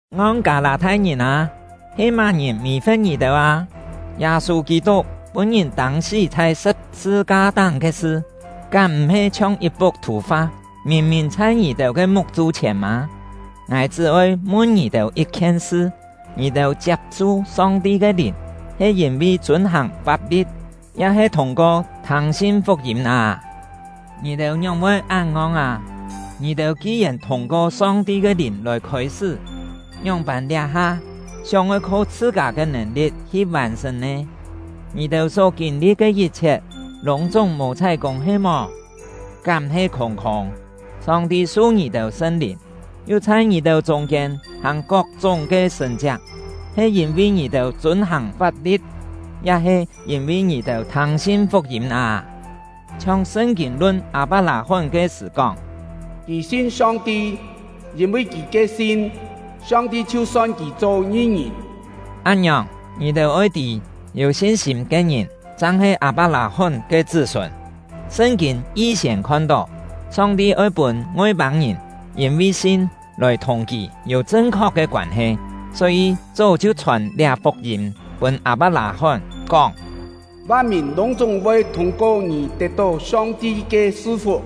Ngong Kâ-lâ-thai-ngìn â! He má-ngìn mì-fe̍t ngì-têu â? Yâ-sû Kî-tuk pûn-ngìn tâng-sí chhai sṳ̍p-sṳ-ka-táng ke sṳ, kám m̀-he chhiong yit-puk thù-fa, mìn-mìn chhai ngì-têu ke muk-chû-chhièn mâ? Ngài chṳ́-oi mun ngì-têu yit-khien sṳ: Ngì-têu chiap-su Song-ti ke Lìn he yîn-vi chûn-hàng fap-li̍t, ya-he thûng-ko thâng-sin fuk-yîm â? Ngì-têu ngióng-voi án ngong â? Ngì-têu ki-yèn thûng-ko Song-ti ke Lìn lòi khôi-sṳ́, ngióng-pân liá-ha sióng-oi kho chhṳ-kâ ke nèn-li̍t hi vàn-sṳ̀n nè? Ngì-têu só kîn-li̍t ke yit-chhiet lûng-chúng mò chhái-kûng he-mò? Kám he khûng-khûng! Song-ti su ngì-têu Sṳn-Lìn, yu chhai ngì-têu chûng-kiên hàng kok-chúng ke sṳ̀n-chiak, he yîn-vi ngì-têu chûn-hàng fap-li̍t, ya-he yîn-vi ngì-têu thâng-sin fuk-yîm â? Chhiong Sṳn-kîn lun Â-pak-lâ-hón ke sṳ̀ kóng: “Kì sin Song-ti, yîn-vi kì ke sin, Song-ti chhiu son kì cho ngi-ngìn.” Án-ngiòng, ngì-têu oi tî, yû sin-sîm ke ngìn chang he Â-pak-lâ-hón ke chṳ́-sûn. Sṳn-kîn yi-siên khon-tó, Song-ti oi pûn Ngoi-pâng-ngìn yîn-vi sin lòi thùng Kì yû chṳn-khok ke koân-he, só-yî chó chhiu chhòn liá fuk-yîm pûn Â-pak-lâ-hón, kóng: “Van-mìn lûng-chúng voi thûng-ko ngì tet-tó Song-ti ke su-fuk!”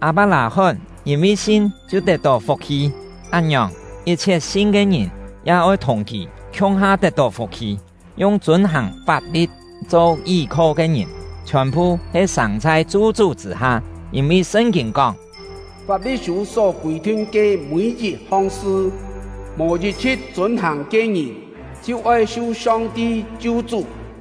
Â-pak-lâ-hón yîn-vi sin chhiu tet-tó fuk-hi; án-ngiòng, yit-chhiet sin ke ngìn ya oi thùng kì khiung-ha tet-tó fuk-hi! Yung chûn-hàng fap-li̍t cho yí-kho ke ngìn chhiòn-phu he sâng chhai chu-chú chṳ̂-ha; yîn-vi Sṳn-kîn kóng: “Fap-li̍t-sû só kûi-thin ke mî-yit-hong sṳ, mò yit-chhṳ̍t chûn-hàng ke ngìn, chhiu oi su Song-ti chu-chú.”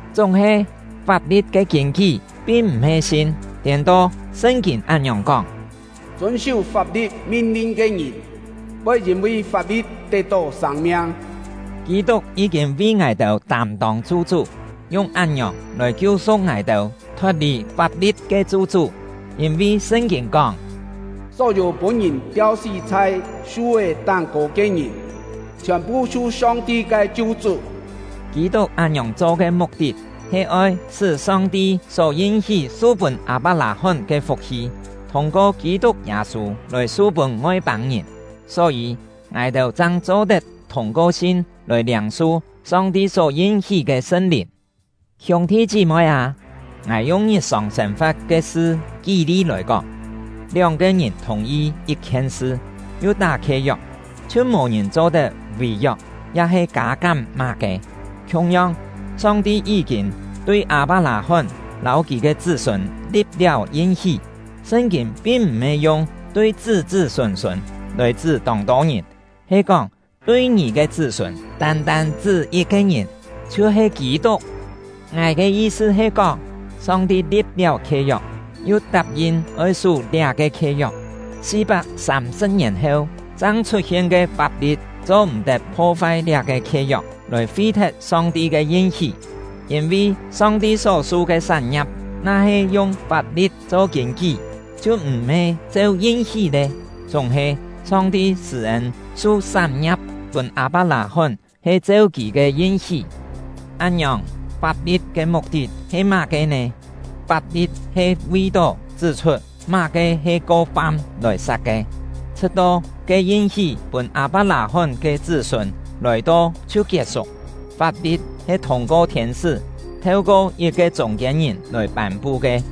Chúng-he, fap-li̍t ke kîn-kí pin m̀-he sin; tiên-to, Sṳn-kîn án-ngiòng kóng: “Chûn-sú fap-li̍t min-lin ke ngìn, voi yîn-vi fap-li̍t tet-tó sâng-miang.” Kî-tuk yí-kîn vi ngài-têu tâm-tông chu-chú, yung án-ngiòng lòi kiu-su̍k ngài-têu thot-lì fap-li̍t ke chu-chú; yîn-vi Sṳn-kîn kóng: “Só-yû pûn-ngìn tiau-sí chhai su-é táng-kô ke ngìn, chhiòn-phu su Song-ti ke chu-chú.” Kî-tuk án-ngiòng cho ke muk-tit he oi sṳ́ Song-ti só yin-hí su-pûn Â-pak-lâ-hón ke fuk-hi, thûng-ko Kî-tuk Yâ-sû lòi su-pûn Ngoi-pâng-ngìn; só-yî, ngài-têu chang cho-tet thûng-ko sin lòi liâng-su Song-ti só yin-hí ke Sṳn-Lìn. Hiûng-thi chí-moi â, ngài yung ngit-sòng sên-fa̍t ke sṳ kí-li lòi kóng: Lióng-ke ngìn thùng-yi yit-khien sṳ, yu tá khie-yok, chhiu mò ngìn cho-tet vì-yok ya-he kâ-kám má-ke. Khiung-yong, Song-ti yí-kîn tui Â-pak-lâ-hón lâu kì ke chṳ́-sûn li̍p-liáu yin-hí. Sṳn-kîn pin m̀-he yung “tui chṳ́-chṳ́ sûn-sûn” lòi chṳ́ tông-tô ngìn; he kóng “tui ngì ke chṳ́-sûn”, tân-tân chṳ́ yit-ke ngìn, chhiu-he Kî-tuk. Ngài ke yi-sṳ he kóng: Song-ti li̍p-liáu khie-yok, yu tap-yin oi sú liá-ke khie-yok. Si-pak sâm-sṳ̍p ngièn heu chang chhut-hien ke fap-li̍t cho-m̀-tet pho-fai liá-ke khie-yok, lòi fi-thet Song-ti ke yin-hí. Yîn-vi Song-ti só-su ke sán-ngia̍p na-he yung fap-li̍t cho kîn-kí, chhiu m̀-he cheu yin-hí lé; chúng-he, Song-ti sṳ̂-ên su sán-ngia̍p pûn Â-pak-lâ-hón he cheu Kì ke yin-hí. Án-ngiòng, fap-li̍t ke muk-tit he má-ke nè? Fap-li̍t he vi-tó chṳ́-chhut má-ke he ko-fam lòi sat ke, chhṳ̍t-to ke yin-hí pûn Â-pak-lâ-hón ke “chṳ́-sûn” lòi-to chhiu kiet-suk. Fap-li̍t he thûng-ko thiên-sṳ́, theu-ko yit-ke chûng-kiên-ngìn lòi pân-pu ke.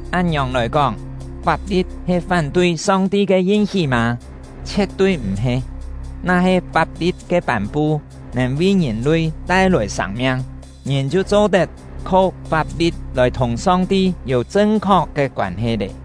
Án-ngiòng lòi kóng, fap-li̍t he fán-tui Song-ti ke yin-hí mâ? Chhie̍t-tui m̀-he! Na-he fap-li̍t ke pân-pu nèn vi ngìn-lui tai-lòi sâng-miang, ngìn chhiu cho-tet kho fap-li̍t lòi thùng Song-ti yû chṳn-khok ke koân-he lé.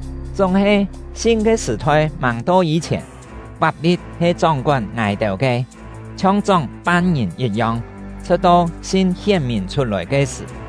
Chúng-he, “sin” ke sṳ̀-thoi màng to yî-chhièn, fap-li̍t he chóng-kón ngài-têu ke, chhiong chóng fam-ngìn yit-yong, chhṳ̍t-to “sin” hién-mìn chhut-lòi ke-sṳ̀.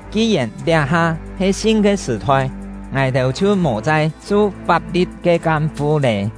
Ki-yèn liá-ha he “sin” ke sṳ̀-thoi, ngài-têu chhiu mò chai su fap-li̍t ke kam-fu lé.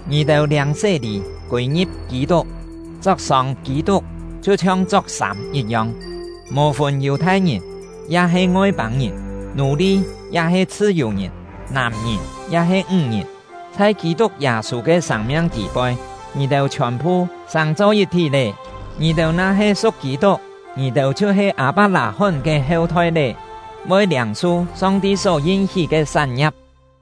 Ngì-têu liâng sé-lî kûi-ngi̍p Kî-tuk, chok-sông Kî-tuk chhiu-chhiong chok-sâm yit-yong. Mò fûn Yù-thai-ngìn ya-he Ngoi-pâng-ngìn, nù-li ya-he chhṳ-yù-ngìn, nàm-ngìn ya-he ńg-ngìn, chhai Kî-tuk Yâ-sû ke sâng-miang tî-poi, ngì-têu chhiòn-phu sàng-cho yit-thí lé. Ngì-têu na-he su̍k Kî-tuk, ngì-têu chhiu-he Â-pak-lâ-hón ke heu-thoi lé, voi liâng-su Song-ti só yin-hí ke sán-ngia̍p.